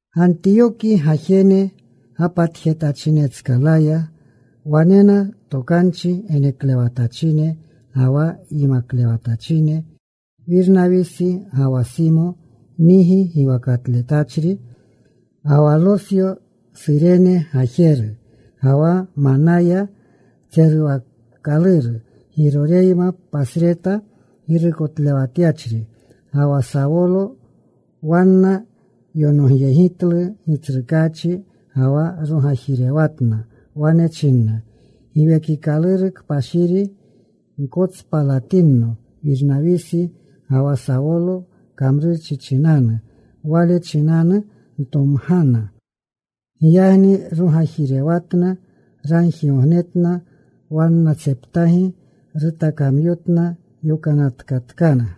Gantiyoki gajene gapatjetachinetskalaya wanena tokanchi geneklewatachine ga wa yimaklewatachine. Wirnawisi, ga wa Simo, Nigi giwakatletachri, ga wa Losyo, Surene gajeru, ga wa Manaya tseruwaakaluru Giroreyma, pasreta girukotlewatyachri, ga wa Sawolo. Wanna yonogyegitlu Gitsrukaachi, ga wa rogajirewatna. Wane china Giwekikaluru Kpashiri, “Gkotspalatinno Wirnawisi ga wa Sawolo kamrurchi chinanu. Wale chinanu ntomgana.” Giyagni rogajirewatna. Ragjigognetna. Wannatseptagi rutakamyotna. Yokanatkatkana.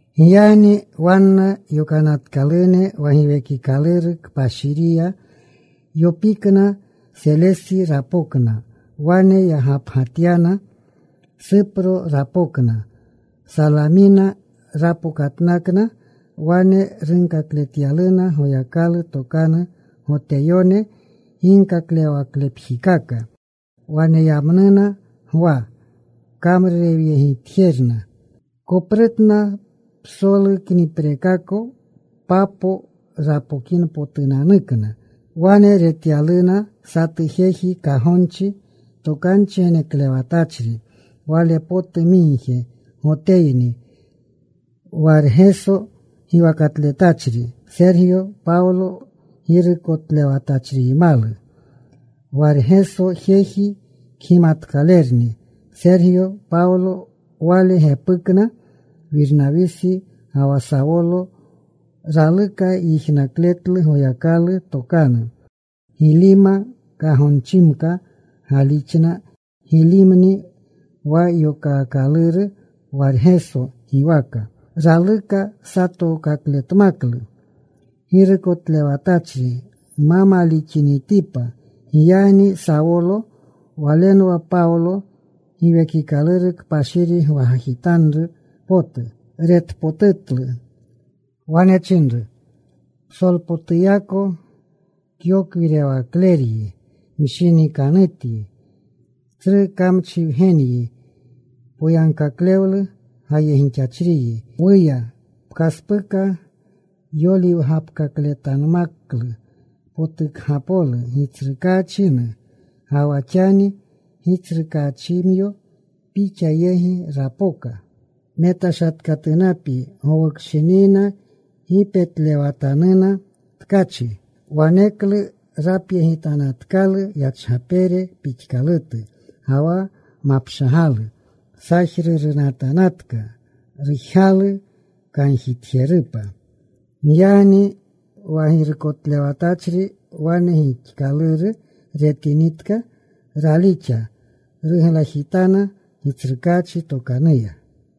Giyagni wanna yokanatkalune wa Giwekikaluru Kpashiriya yopikna. Selesi rapokna. Wane yagapgatyana. Supro rapokna. Salamina rapokatnakna. Wane runkakletyaluna Goyakalu tokanu Goteyone ginkaklewawaklepjikaka. Waneyamnuna Gwa kamrurewyegitjerna. Koprutna psolu kniprekako, Papo rapokinpotukna. Wane retyaluna satu jeji kagonchi, tokanchi geneklewatachri wale potu migje. Goteyni. Wargeso giwakatletachri. Sergyo Pawlo girukotlewatachriymalu Wargeso. Jeji kgimatkalerni Sergyo Pawlo. Wale gepukna Wirnawisi ga wa Sawolo. Raluka yijnakletlu Goyakalu tokanu. Gilima kagonchimka gaalixna. Gilimni wa yokaakaluru Wargeso giwaka. Raluka satookakletmaklu girukotlewatachri ma malixinitipa. Giyagni Sawolo, walenwa Pawlo, Giwekikaluru Kpashiri gwagajitanru potu, retpotutlu. Wane chinru, “Psolpotuyako kyokwirewakleryi, mshinikanutyi. Tsru kamchi wgenyi. Poyagkaklewlu gayegixachriyi. ¡Wuya! ¡Pkaspuka yoliwgapkakletanmaklu potukgapolu Gitsrukaachinu! Ga wa xani, Gitsrukaachimyo pixa yegi rapoka. Metashatkatunapyi. Gowukshinina gi petlewatanuna tkachi.” Waneklu rapyegitanatkalu yachgapere pixkalutu ga wa mapshagalu. Sajrurunatanatka. Rujgalu kanjitjerupa. Giyagni wa girukotlewatachri wane gixkaluru retinitka, ralixa. Ruglajitana Gitsrukaachi tokanuya.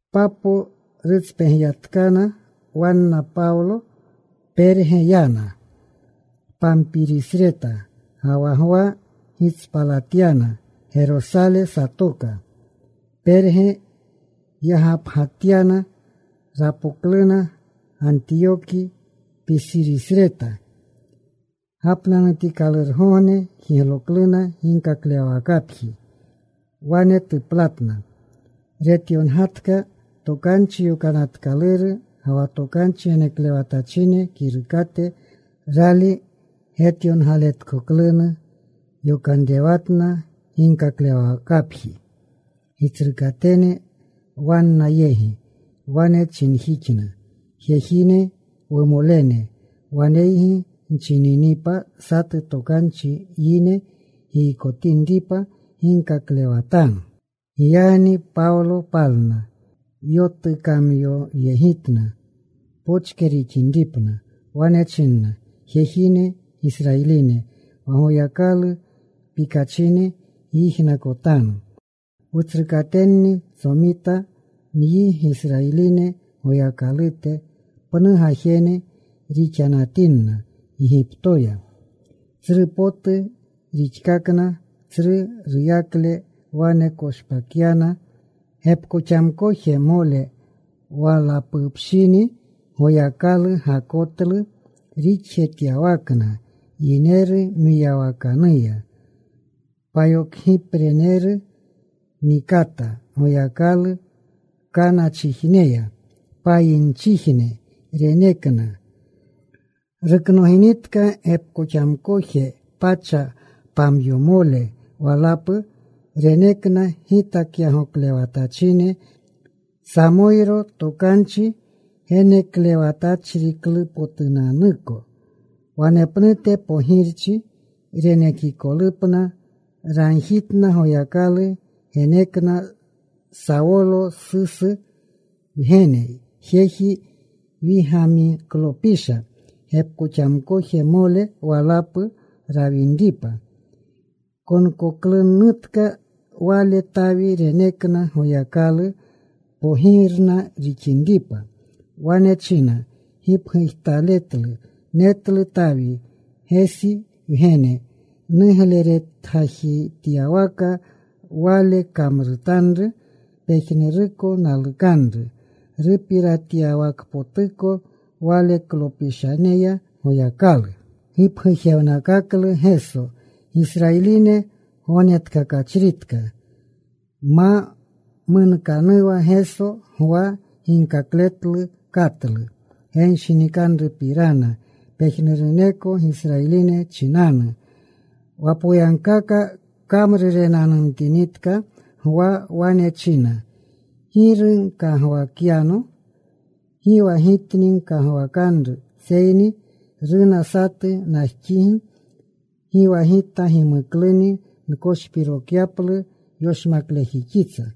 Papo rutspegyatkana wanna Pawlo. Perge yana Pampirisreta. Ga wa Gwa gitspalatyana. Gerosale satoka. Perge yagapgatyana. Rapokluna Gantiyoki, Pisirisreta. Gapnanutikalurgogne jiglokluna ginkaklewawakapji. Wane tuplatna. Retyongatka Tokanchi Yokanatkaluru ga wa tokanchi geneklewatachine kirukate. Rali getyongaletkoklunu yokanrewatna ginkaklewawakapji gitsrukatene wanna yegi. Wane chinjixkana, “Jejine, wumolene, waneygi nchininipa satu tokanchi yine giykotinripa, ginkaklewatanu.” Giyagni Pawlo palna. Yotukamyoyegitna pochke rixinripna. Wane china, “Jejine, Gisrayiline, wa Goyakalu pikachine, gyijnakotanu. Wutsrukatenni tsomita nyi Gisrayiline Goyakalute. Pnu gajene rixanatinna Gigiptoya, tsru potu rixkakna. Tsru ruyakle wane koshpakyana. Gepkoxamkojmole walapupshini Goyakalu gakotlu rixjetyawakna yineru mwiyawakanuya. Payokgipreneru nikata Goyakalu Kanachijneya. Payinnichijne renekna. “Ruknoginitka gepkoxamkoje pacha pamyomole walapu, renekna gitakyagoklewatachine, Samoyro tokanchi geneklewatachriklupotunanuko. Wanepnute pogirchi renekikolupna ragjitna. Goyakalu genekna Sawolo, Susu wgene, jeji Wigamiklopisha, gepkoxamkojmole walapu rawinripa. Konkoklunutka wale. Tawi renekna Goyakalu pogirna rixinripa. Wane china gipgujtaletlu, Netlu Tawi, Gesi wgene, nugleretgajityawaka. Wale kamrutanru pejnuruko nalukanru. “Rupiratyawakpotuko waleklopishaneya Goyakalu gipgujewnakaklu Geso, Gisrayiline Gognetkakachritka. Ma munkanuwa Geso, Gwa ginkakletlu katlu genshinikanrupirana pejnuruneko Gisrayiline chinanu. Wa poyagkaka kamrurenanumtinitka Gwa, wane china, ‘¿Giru gkagwakyano? Gi wa gitni gkagwakanru, seyni runa satu najxigi. Gi wa gita gimukluni nkoshpirokyaplu yoshmaklejixitsa.’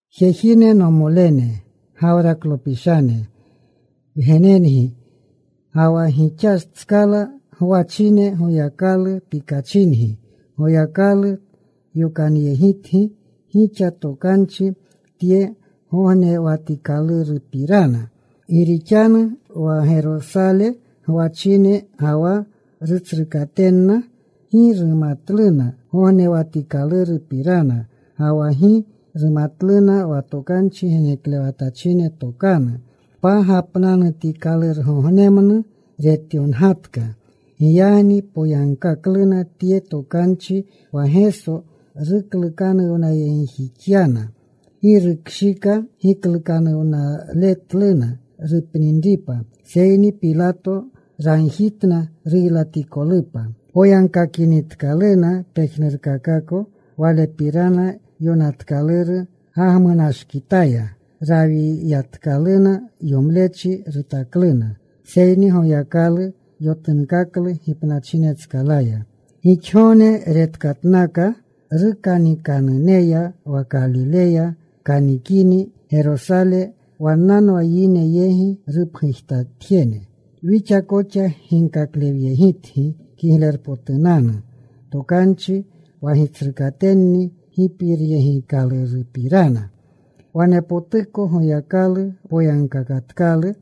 “Jejine, nomolene, Gawraklopishane wgenengi, ga wa gixatskala gwachine. Goyakalu pikachingi, Goyakalu yokanyegitgi gixa tokanchi tye gognewatikalurupirana. Gi rixanu wa Gerosale gwachine ga wa rutsrukatenna gi rumatluna gognewatikalurupirana. Ga wa gi rumatluna wa tokanchi geneklewatachine tokanu pagapnanutikalurgognemnu retyongatka. Giyagni poyagkakluna tye tokanchi wa Geso ruklukanuwnayegjixyana. Gi rukshika giklukanuwnaletluna rupninripa, seyni Pilato ragjitna ruylatikolupa. Poyagkakinitkaluna pejnurkakako Walepirana yonatkaluru, gagmunashkitaya rawiyatkaluna. Yomlechi rutakluna. Seyni Goyakalu yotunkaklu gipnachinetskalaya. Gixgogne retkatnaka rukanikanuneya wa Kalileya kanikini Gerosale. Wannanwa yine yegi rupgujtatjene. “Wixa koxa ginkaklewyegitgi Kiglerpotunanu Tokanchi wa gitsrukatenni gipiratyegitkalurupirana. Wanepotuko Goyakalu poyagkakatkalu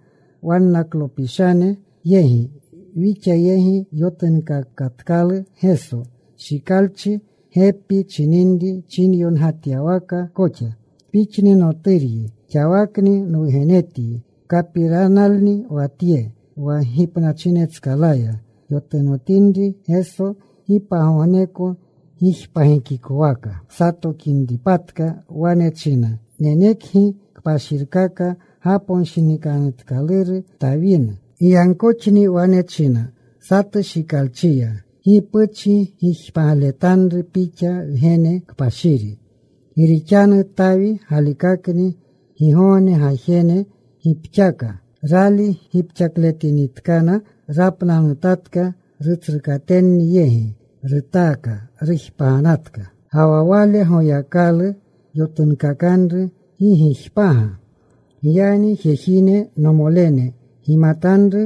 wannaklopishane yegi: wixa yegi yotunkakatkalu Geso. Shikalchi gepi chininri chinyongatyawaka koxa: Pixni Noturyi. Xawakni nwugenetyi. “Kapiranalni wa tye: wa gipnachinetskalaya yotunotinri Geso, gi pagogneko gijpagikowaka satokinripatka. Wane china: Nenekangi kpashirkaka gaponshinikanutkaluru Tawinu. “Giyagkoxni wane china satu shikalchiya: Gi puchi gijpagletanru Pixa Wgene kpashiri. “Gi rixanu Tawi galikakni gigogne gajene gipxaka. Rali gipxakletinitkana, rapnanutatka. Rutsrukatenni yegi rutaaka. Rujpaganatka. Ga wa Wale Goyakalu yotunkakanru gi gijpaga. “Giyagni jejine, nomolene, gimatanru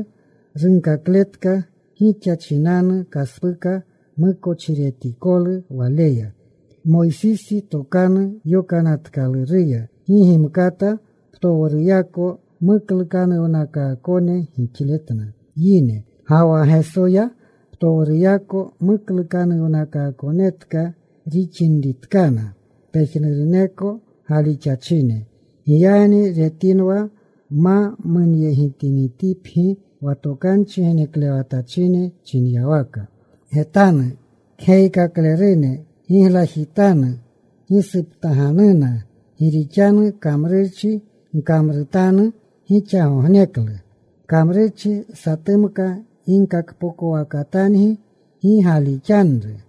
runkakletka gixa chinanu kaspuka mukochiretikolu Waleya. Moysisi Tokanu Yokanatkaluruya gi gimkata ptowruyako muklukanuwnakaakone gixletna yine, ga wa Gesoya ptowruyako muklukanuwnakaakonetka rixinritkana pejnuruneko galixachine. Giyagni getinwa ma munyegitinitipgi wa tokanchi geneklewatachine chinyawaka: Getanu kgeyikaklerune. Giglajitanu. Gisuptaganuna. Gi rixanu kamrurchi nkamrutanu gixagogneklu. Kamrurchi satumka ginkakpokowakatangi gi galixanru.”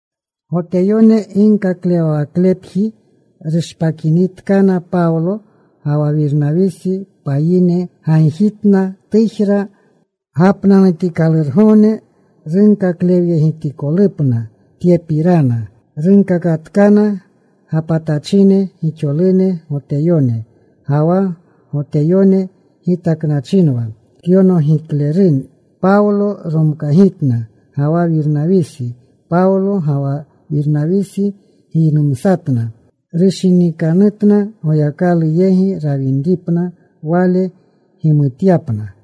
Goteyone ginkaklewawaklepji rushpakinitkana Pawlo ga wa Wirnawisi, payine gagjitna tujra gapnanutikalurgogne runkaklewyegitikolupna tyepirana. Rungakatkana gapatachine. Gixolune Goteyone ga wa Goteyone gitaknachinwa kyonogiklerune, Pawlo romkagitna ga wa Wirnawisi. Pawlo ga wa Wirnawisi giynumsatna. Rushinikanutkana Goyakalu yegi rawinripna Wale gimutyapna.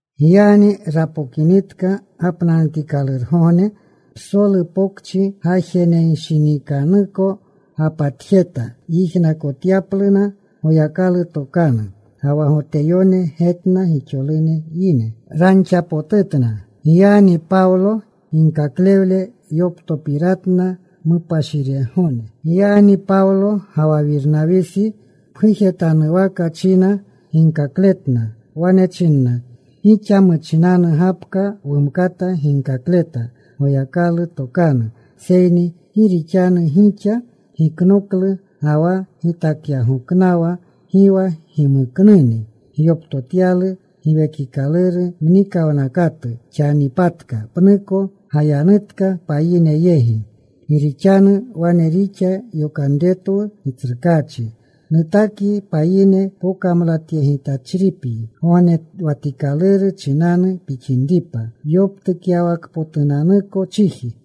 Giyagni rapokinitka gapnanutikalurgogne psolu pokchi gajenenshinikanuko gapatjeta yijnakotyapluna Goyakalu tokanu. Ga wa Goteyone getna gixolune yine. Ranxapotutna. Giyagni Pawlo ginkaklewle yoptopiratna mupashiregone. Giyagni Pawlo ga wa Wirnawisi pgujetanuwaka china ginkakletna. Wane chinna, “Gixa muchinanu gapka wumkata ginkakleta Goyakalu tokanu. Seyni gi rixanu gixa giknoklu, ga wa gitakyagoknawa gi wa gimuknuni gyoptotyalu giwekinri mnikawnakatu, xanipatka pnuko gayanutka payine yegi. Gi rixanu wane rixa yokanretwu Gitsrukaachi: Nutakyi payine pokamlatyegitachripyi Gognewatikaluru chinanu pixinripa yoptukyawakpotunanuko chiji.”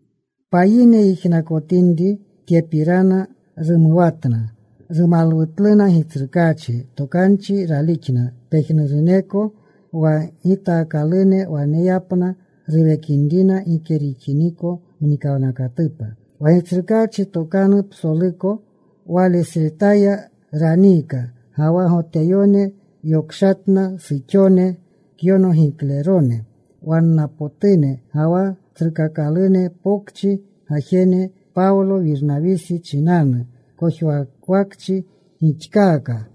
Payine yijnakotinri tyepirana, rumuwatna. Rumalwutluna Gitsrukaachi tokanu. Ralixna pejnuruneko wa gitaakalune waneyapna ruwekinrina gike rixiniko mnikawnakatupa. Wa Gitsrukaachi tokanu psoluko walesretaya raniika. Ga wa Goteyone yokshatna suxone kyonogiklerone wannapotune, ga wa tsrukakalune pokchi gajene. Pawlo, Wirnawisi chinanu kojwawakchi gixkaaka.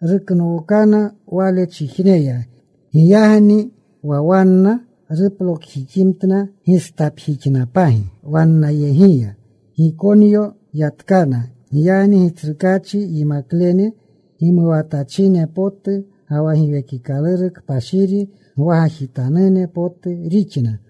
Ruknookana wanechijneya. Giyagni wa wanna ruplokjiximtna gistapjixnapagi wannayegiya. Gikonyo yatkana. Giyagni Gitsrukaachi yimaklene gimuwaatachine potu ga wa Giwekikaluru Kpashiri gwagajitanune potu rixna.